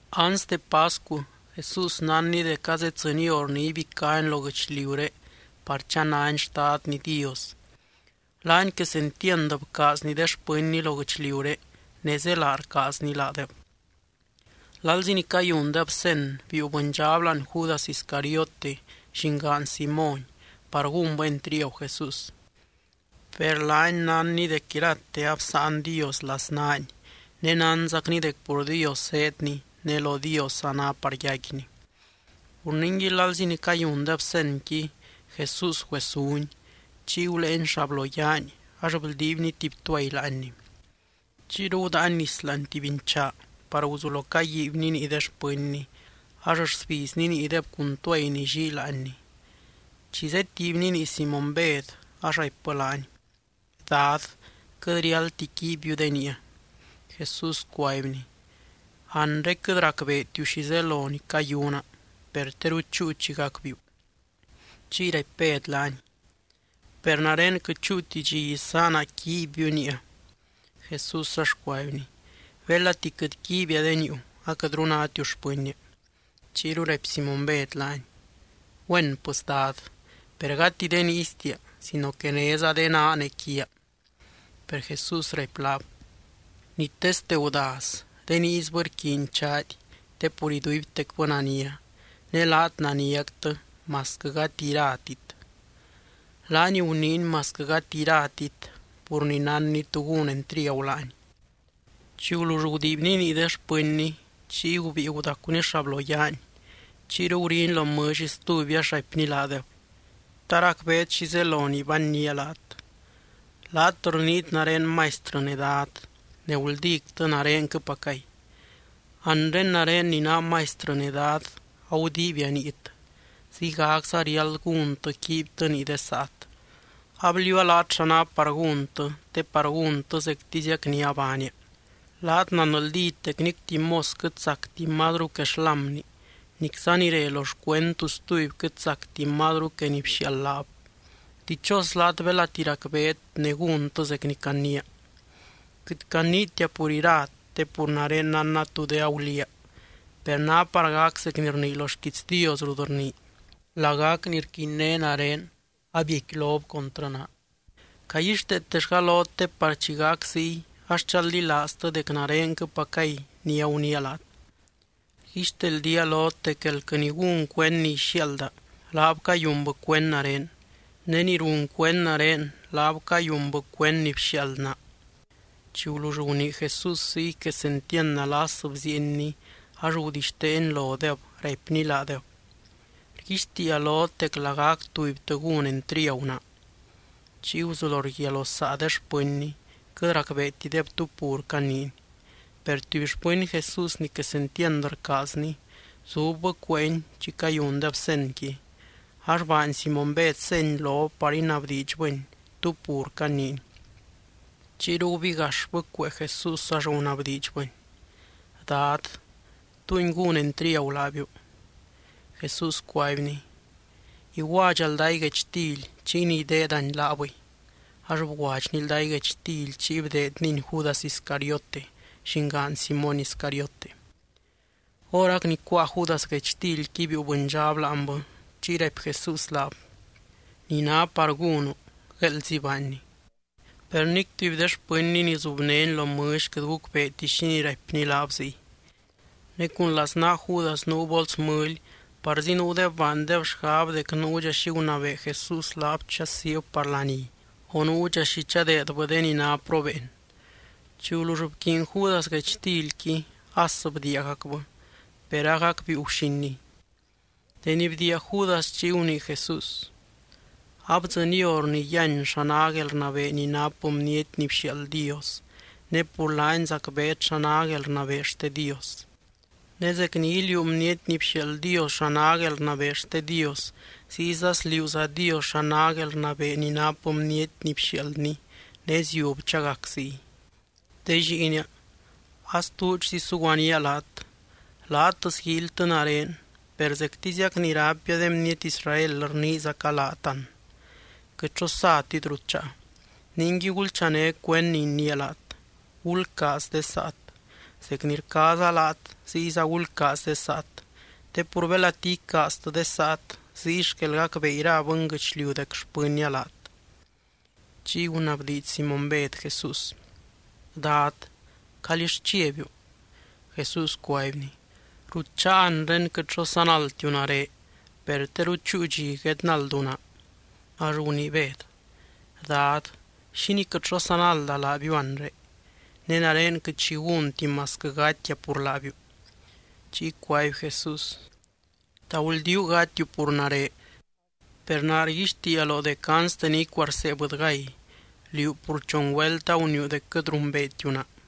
Anste pascu, Jesús nánny dec azeddzɨny hor ni ibicány lo guɨchliuré par chanany Xtadny Dios. Laany quesentiand bcaazny de xpɨnny lo guɨchliuré, ne zélaa rcaazny laadeb. Lalzi ni cayundeb cen, biiu bɨndxab láani Judas Iscariote llingaan Simóny par gúnbɨ entriagu Jesús. Per laany nánny dec irate absáan Dios laznaany ne nánzacny dec pur Dios zéedny ne lo Diosza ná par yaicquiny. Pur ningui lalzi ni cayundeb cenqui, Jesús güesuny. Chiy guléeny xabloyaany ax bldiibny tuby tuay láanny. Chiyru gudáany nis láani tuby nchaa par guzulo caguiibyny nii de xpɨnny ax rsbizny niideb cun tuay ni llii láanny. Chi zétiibny nii Simóny Bed, ax raipbɨ laany: —Dad, quɨt riáldti quiibbiu de niia. Jesús cuaibny: —Anre quɨt racbeetiu xi zelo ni cayuna, per teru chúu chi gacbiiu. Chiy raipy Bed laany: —Per nare quɨt chúuti dxi isaana quiibbiu niia. Jesús ax cuaibny: —Belati quɨt quiibia de niiu, aquɨtru nátiu xpɨnnia. Chiyru raipy Simóny Bed laany: —Güén pɨs, Dad, per gati de niistia sino que néza de naa ne quiaa. Per Jesús raipy laab: —Ni teste gudaz, de niisbɨ rquiiny chaady te pur iduibtecbɨ nania. Ne laat naniactɨ, masquɨ gati iratit. Laany guniiny “masquɨ gati iratit” pur ni nánny tú gún entriagu laany. Chi gulull gudiibny nii de xpɨnny, chiy gubíi gudacuny xabloyaany. Chiyru guriny lo mɨlly stuby ax raipny laadeb: —¿Ta racbeet xi zelo ni bannía laat? Laat rniit nare Maistrɨ ne Dad, ne guldíctɨ narenquɨpacay. Anre nare ni naa Maistrɨ ne Dad agudiibia niit, ziygacza riáld gúntɨ, quiibytɨ nii de saat. Abliuua laat xa ná par gúntɨ, te par gúntɨ zectiziac ni abaania. Laat nanldít dec nic tuby mos quɨt sacti mazru que xlámni nicza ni re lo xcuend tu stuby quɨt sactib mazru que ni bxiaald laab. Dichos laat belati racbeet ne gúntɨ zec ni caniia. ’Quɨt caniitia pur irat te pur nare nánna tú de aguliaa. Per ná par gac zec ni rnii lo xquiits Dios rut rnii: “Lagac ni rquinné nare, abiecquilob contrɨ naa.” Caguixteetellga lot te par chi gac ziy ax chaldilaaztɨ dec narenquɨpacay ni aguniia laat. Rguixteldía lot dec elquɨ ni gún cuend ni ixiaalda, laab cayunbɨ cuend nare. Ne ni run cuend nare, laab cayunbɨ cuend ni bxiaald naa. Chi gulull gunii Jesús ziy, quesentiand nalas bziienny, ax gudixteeny lodeb raipny laadeb: —Rguixtiia lot dec lagac tubytɨ gún entriagu naa. Chiy guzulo rguiaa lo saa de xpɨnny. Quɨt racbeetideb tú pur caniiny. Per tuby xpɨny Jesús ni quesentiand rcaazny, zubbɨ cueeny chi cayundeb cenqui. Ax baany Simóny Bed seny lob par inabdiidxbɨny tú pur caniiny. Chiyru gubigaxbɨ cuee Jesús ax gunabdiidxbɨny: —Dad, ¿túngui gún entriagu laabiu? Jesús cuaibny: —Iguadxa lday guechtily. Chiy ni ideedani, laabɨy. Ax bguadxny lday guechtily chiy bdeednyni Judas Iscariote, llingaan Simóny Iscariote. Horac ni cuáa Judas guechtilqui, biiu bɨndxab láanbɨ. Chiy raipy Jesús laab: —Ni ná par gúnu, gueeldzi baanni. Per nic tuby de xpɨnny ni zubnény lo mɨlly quɨt gucbeeti xínii raipny laab ziy. Ne cun laznaa Judas nuu bols mɨly, parzi nuudeb baandeb xgab dec nuudxa xi gunabee Jesús laab chasiib par laní, o nuudxa xi chadeedbɨ de ni ná probeen. Chi gulull bquiiny Judas guechtilqui, as bdiiagacbɨ. Per agac biiu guxiniy. Deni bdiia Judas, chiy gunii Jesús: —Abdzɨny hor ni yíany xa ná guelrnabee ni nap Bniety ni bxiaald Dios, ne pur laany zacbeet xa ná guelrnabee xte Dios. Ne zec ni iliuu Bniety ni bxiaald Dios xa ná guelrnabee xte Dios, ziyza sliuuza Dios xa ná guelrnabee ni nap Bniety ni bxiaaldny, ne ziub chagac ziy. De lliinia, astuudxzi suguanía laat. Laat sguíilytɨ nare, per zectiziac ni raipia de bniety Israel rniizaca laat an: quɨt xo satit rut cháa. Ningui gulchané cuend ni iniia laat: Gulcaaz de saat. Zec ni rcaaza laat, ziyza gulcaaz de saat. Te pur belati icaaztɨ de saat, ziy xquel gacbee ira bɨnguɨchliu dec xpɨnnia laat. Chiy gunabdiidx Simóny Bed Jesús: —Dad, ¿calíll chiabiu? Jesús cuaibny: —Rut cháa anre, quɨt xo sanaldtiu nare. Per teru chúu dxi guednaldu naa. Ax gunii Bed: —Dad, ¿xínii quɨt xo sanalda laabiu anre? Ne nare quɨt xi gúnti masquɨ gatia pur laabiu. Chiy cuaby Jesús: —¿Ta guldíu gatiu pur nare? Per naa rguixtiia loo dec anste ni icuarsee bɨdygay, liú pur chon güelt aguniiu dec quɨt rumbeetiu naa.